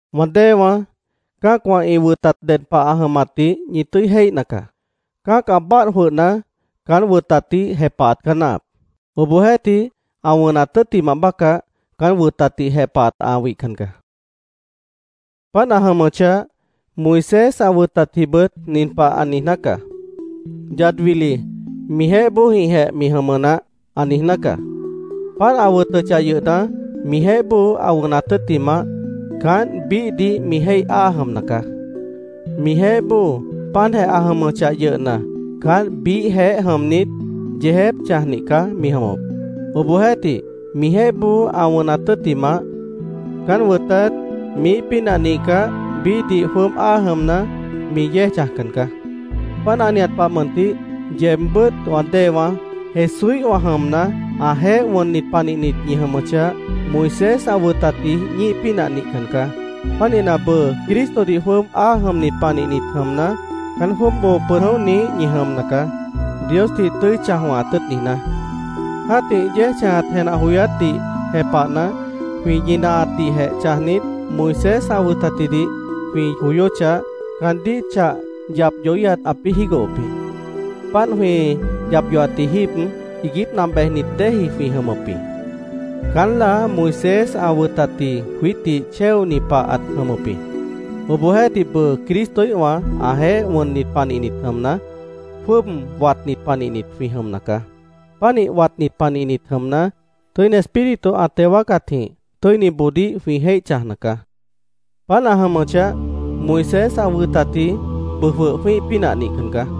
Wã déewãá, cã́acwã ĩ wʉtat ded pah ã jʉmatdih ñi tʉ́i jéihna caá. Cã́ac ã báadh jwʉhna, caán wʉtatdih jepahat caá náahap. Obohjeéhtih, ã wʉnat tʉ́ttimah bácah, caán wʉtatdih jepahat ã wihcan caá. Páant ã jʉmʉchah, Moisés ã wʉtatjibʉt nin pah ã niijná caá: “Yad wili mijeéh bóojĩhjeh mi jʉmʉ naáh”, ã niijná caá. Páant ã wʉtʉchah yʉhna, mijeéh bóo ã wʉnat tʉ́ttimah, caánt biíhdih mi jéih áa jʉmna caá. Mijeéh bóo páantjeh ã jʉmʉchah yʉhna, caánt biíhjeéh jʉmnit, yeejép chãjnih caá mi jʉmʉp. Obohjeéhtih mijeéh bóo ã wʉnat tʉ́ttimah, caán wʉtat miíh pínah nihcah, biíhdih jwʉ́ʉb áa jʉmna, mi yéej chãjcan caá. Páant ã nihat pah mʉntih, yeebbʉ́t wã déewãá, Jesúíhwã jʉmna, ãjeéh wʉnnit panihnit ñi jʉmʉchah, Moisés ã wʉtatji ñíih pínah nihcan caá. Pánihna, bʉʉ Cristodih jwʉ́ʉb áa jʉmnit panihnit jʉmna, caán jwʉ́ʉb boo pʉd jʉ̃óhniíh ñi jʉmna caá, Diosdih tʉ́i chãj wʉ̃hat tʉ́ʉt niijná. Jã́tih yéej chãjat jenah joyátdih jepahna, jwĩ ñinahatdihjeh chãjnit, Moisés ã wʉtatjidih jwĩ joyóchah, caandíh chah yap yohíhat ãpĩ́ jígohop jĩ. Páant jwĩ yap yohatji jíib, iiguípna bejnit déeji jwĩ jʉmʉp jĩ. Caán láa Moisés ã wʉtatji jwiítdih chéoni pah ãt jʉmʉp jĩ. Obohjeéhtih, bʉʉ Cristoíhwã ãjeéh wʉnnit panihnit jʉmna, jwʉ́ʉb watnit panihnit jwĩ jʉmna caá. Pánih watnit panihnit jʉmna, Tʉ́ini Espíritu ã teo wáacatjĩh tʉ́iniboodíh jwĩ jéih chãjna caá. Páant ã jʉmʉchah, Moisés ã wʉtatji bʉʉ jwʉh jwĩ́ih pínah nihcan caá.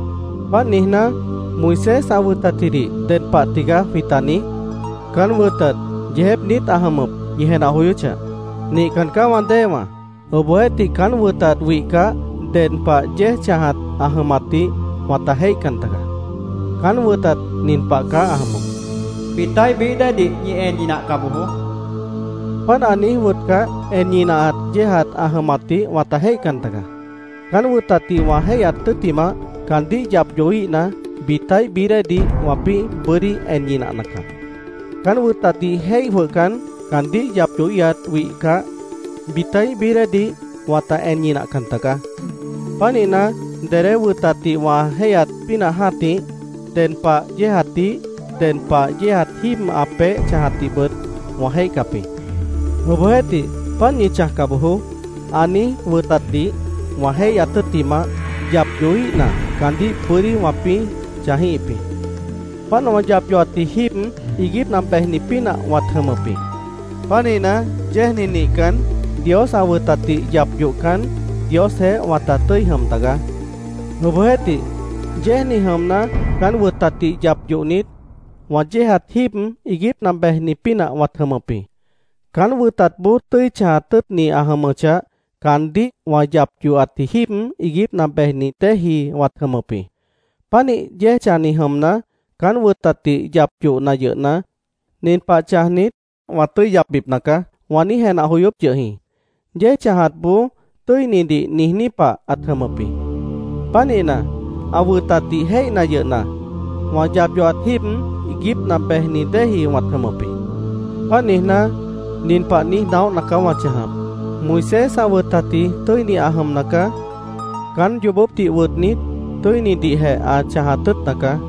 Páant niijná, ¿Moisés ã wʉtatjidih ded pah tigaá jwĩta niíj? ¿Caán wʉtat yeejép niít ã jʉmʉp, ñi jenah joyóchah? ¡Nihcan caá, wã déewã! Obohjeéhtih, caán wʉtat wihcah, ded pah yéej chãjat ã jʉmatdih wãta jéihcan tagaá. Caán wʉtat nin pah caá ã jʉmʉp: “Bitaíh bií déedih ñi en ñinahca bojoó”, ãt niíj wʉtʉp jĩ. Páant ã niíj wʉtcah, en ñinahat yéejat ã jʉmatdih wãta jéihcan tagaá. Caán wʉtatdih wã jéihyat tʉ́ttimah, caandíh yap yohíhna, bitaíh bií déedih wãpĩ́ bʉ́dí en ñinahna caá. Caán wʉtatdih jéih jwʉhcan, caandíh yap yohíhat wihcah, bitaíh bií déedih wãta en ñinahcan tagaá. Pánihna, dedé wʉtatdih wã jéihyat pínah jã́tih, ded pah yéejatdih, ded pah yéejat jíib ã peéh chãjatdihbʉt wã jéihcap jĩ. Obohjeéhtih, “Páant ñi chãjca bojoó”, ã niíj wʉtatdih wã jéihyat tʉ́ttimah, yap yohíhna, caandíh bʉ́dí wãpĩ́ chãjíhip jĩ. Páant wã yap yohatji jíib, iiguípna bejni pínah wãt jʉmʉp jĩ. Pánihna, yéejni nihcan, Dios ã wʉtatdih yap yohcan, Diosjeéh wãta tʉ́i jʉm tagaá. Obohjeéhtih, yéejni jʉmna, caán wʉtatdih yap yohnit, wã yéejat jíib iiguípna bejni pínah wãt jʉmʉp jĩ. Caán wʉtatboó tʉ́i chãjat tʉ́ʉtni ã jʉmʉchah, caandíh wã yap yohatji jíib iiguípna bejni déeji wãt jʉmʉp jĩ. Pánih yéej chãjni jʉmna, caán wʉtatdih yap yohna yʉhna, “Nin pah chãjnit, wã tʉ́i yapbipna caá”, wã niíj jenah joyóp yʉh jĩ. Yéej chãjatboó “tʉ́inidih” niijní pah ãt jʉmʉp jĩ. Pánihna, ã wʉtatdih jéihna yʉhna, wã yap yohat jíib iiguípna bejni déeji wãt jʉmʉp jĩ. Páant niijná, nin pah niíj naóhna caá wã chãjap: Moisés ã wʉtatji tʉ́ini ã jʉmna caá. Caán yoobópdih wʉtnit, tʉ́inidihjeh ã chãjat tʉ́ʉtna caá.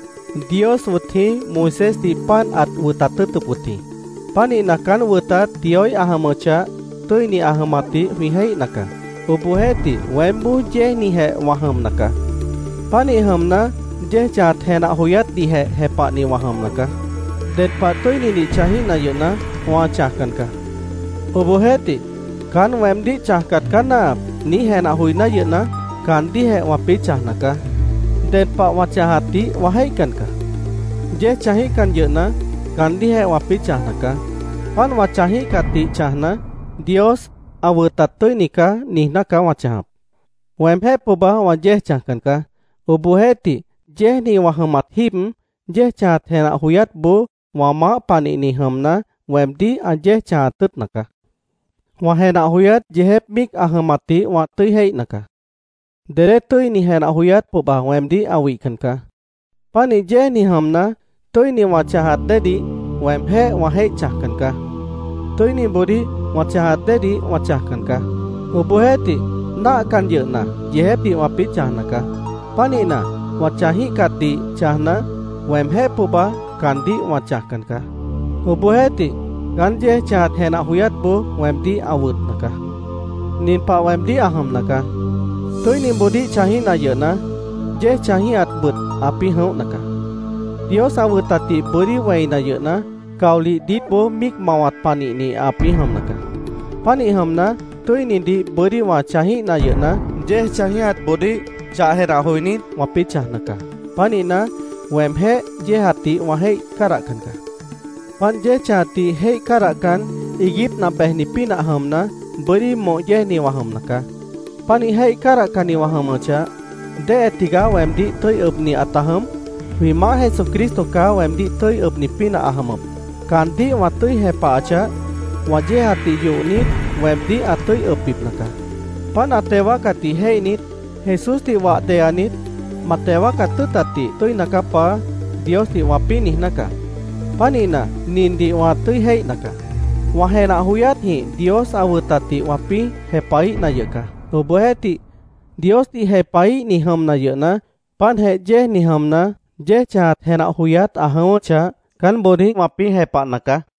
Dios wʉt jĩí Moisésdih páant ãt wʉtat tʉ́ʉtʉp wʉt jĩ. Pánihna, caán wʉtat Dioíh ã jʉmʉchah, tʉ́ini ã jʉmatdih jwĩ jéihna caá. Obohjeéhtih, weémboó yéejnijeh wã jʉmna caá. Pánih jʉmna, yéej chãjat jenah joyátdihjeh jepahni wã jʉmna caá. Ded pah tʉ́inidih chãjíhna yʉhna, wã chãjcan caá. Obohjeéhtih, “Caán weemdíh chãjcat caá náahap”, niíj jenah joiná yʉhna, caandíhjeh wãpĩ́ chãjna caá. Ded pah wã chãjatdih wã jéihcan caá. Yéej chãjíhcan yʉhna, caandíhjeh wãpĩ́ chãjna caá. Páant wã chãjíhcatdih chãjna, “Dios ã wʉtat tʉ́ini caá”, niijná caá wã chãjap. Weemjéh pohba wã yéej chãjcan caá. Obohjeéhtih, yéejni wã jʉmat jíib, yéej chãjat jenah joyátboó wã maáh panihni jʉmna, weemdíh ã yéej chãjat tʉ́ʉtna caá. Wã jenah joyát yeejép míic ã jʉmatdih wã tʉ́i jéihna caá. Dedé tʉ́ini jenah joyát pohba weemdíh ã wihcan caá. Pánih yéejni jʉmna, tʉ́ini wã chãjat déedih, weemjéh wã jéih chãjcan caá. Tʉ́iniboodíh wã chãjat déedih wã chãjcan caá. Obohjeéhtih, náahcan yʉhna, yeejépdih wãpĩ́ chãjna caá. Pánihna, wã chãjíhcatdih chãjna, weemjéh pohba caandíh wã chãjcan caá. Obohjeéhtih, caán yéej chãjat jenah joyátboó weemdíh ã wʉtna caá. Nin pah weemdíh ã jʉmna caá: Tʉ́iniboodíh chãjíhna yʉhna, yéej chãjíhatbʉt ãpĩ́ jʉ̃óhna caá. Dios ã wʉtatdih bʉ́dí wẽina yʉhna, caolih diítboó míic mawat panihni ãpĩ́ jʉmna caá. Pánih jʉmna, tʉ́inidih bʉ́dí wã chãjíhna yʉhna, yéej chãjíhatboodíh chah jenah joinít, wãpĩ́ chãjna caá. Pánihna, weemjéh yéejatdih wã jéih cádahcan caá. Páant yéej chãjatdih jéih cádahcan, iiguípna bejni pínah jʉmna, bʉ́dí moh yéejni wã jʉmna caá. Pánih jéih cádahcanni wã jʉmʉchah, ¿déhe tigaá weemdíh tʉ́i ʉbni ãta jʉm? Jwĩ Maáh Jesucristo caá weemdíh tʉ́i ʉbni pínah ã jʉmʉp. Caandíh wã tʉ́i jepahachah, wã yéejatdih yohnit, weemdíh ã tʉ́i ʉbbipna caá. Páant ã teo wáacatdih jéihnit, “Jesúsdih wah deyanit, ma teo wáacat tʉ́ʉtatdih tʉ́ina caá, Paá”, Diosdih wãpĩ́ niijná caá. Pánihna, nindih wã tʉ́i jéihna caá: wã jenah joyátjĩh Dios ã wʉtatdih wãpĩ́ jepahíhna yʉh caá. Obohjeéhtih, Diosdih jepahíhni jʉmna yʉhna, páantjeh yéejni jʉmna, yéej chãjat jenah joyát ã jʉ̃ʉ́wʉ́chah, caánboodíh wãpĩ́ jepahna caá.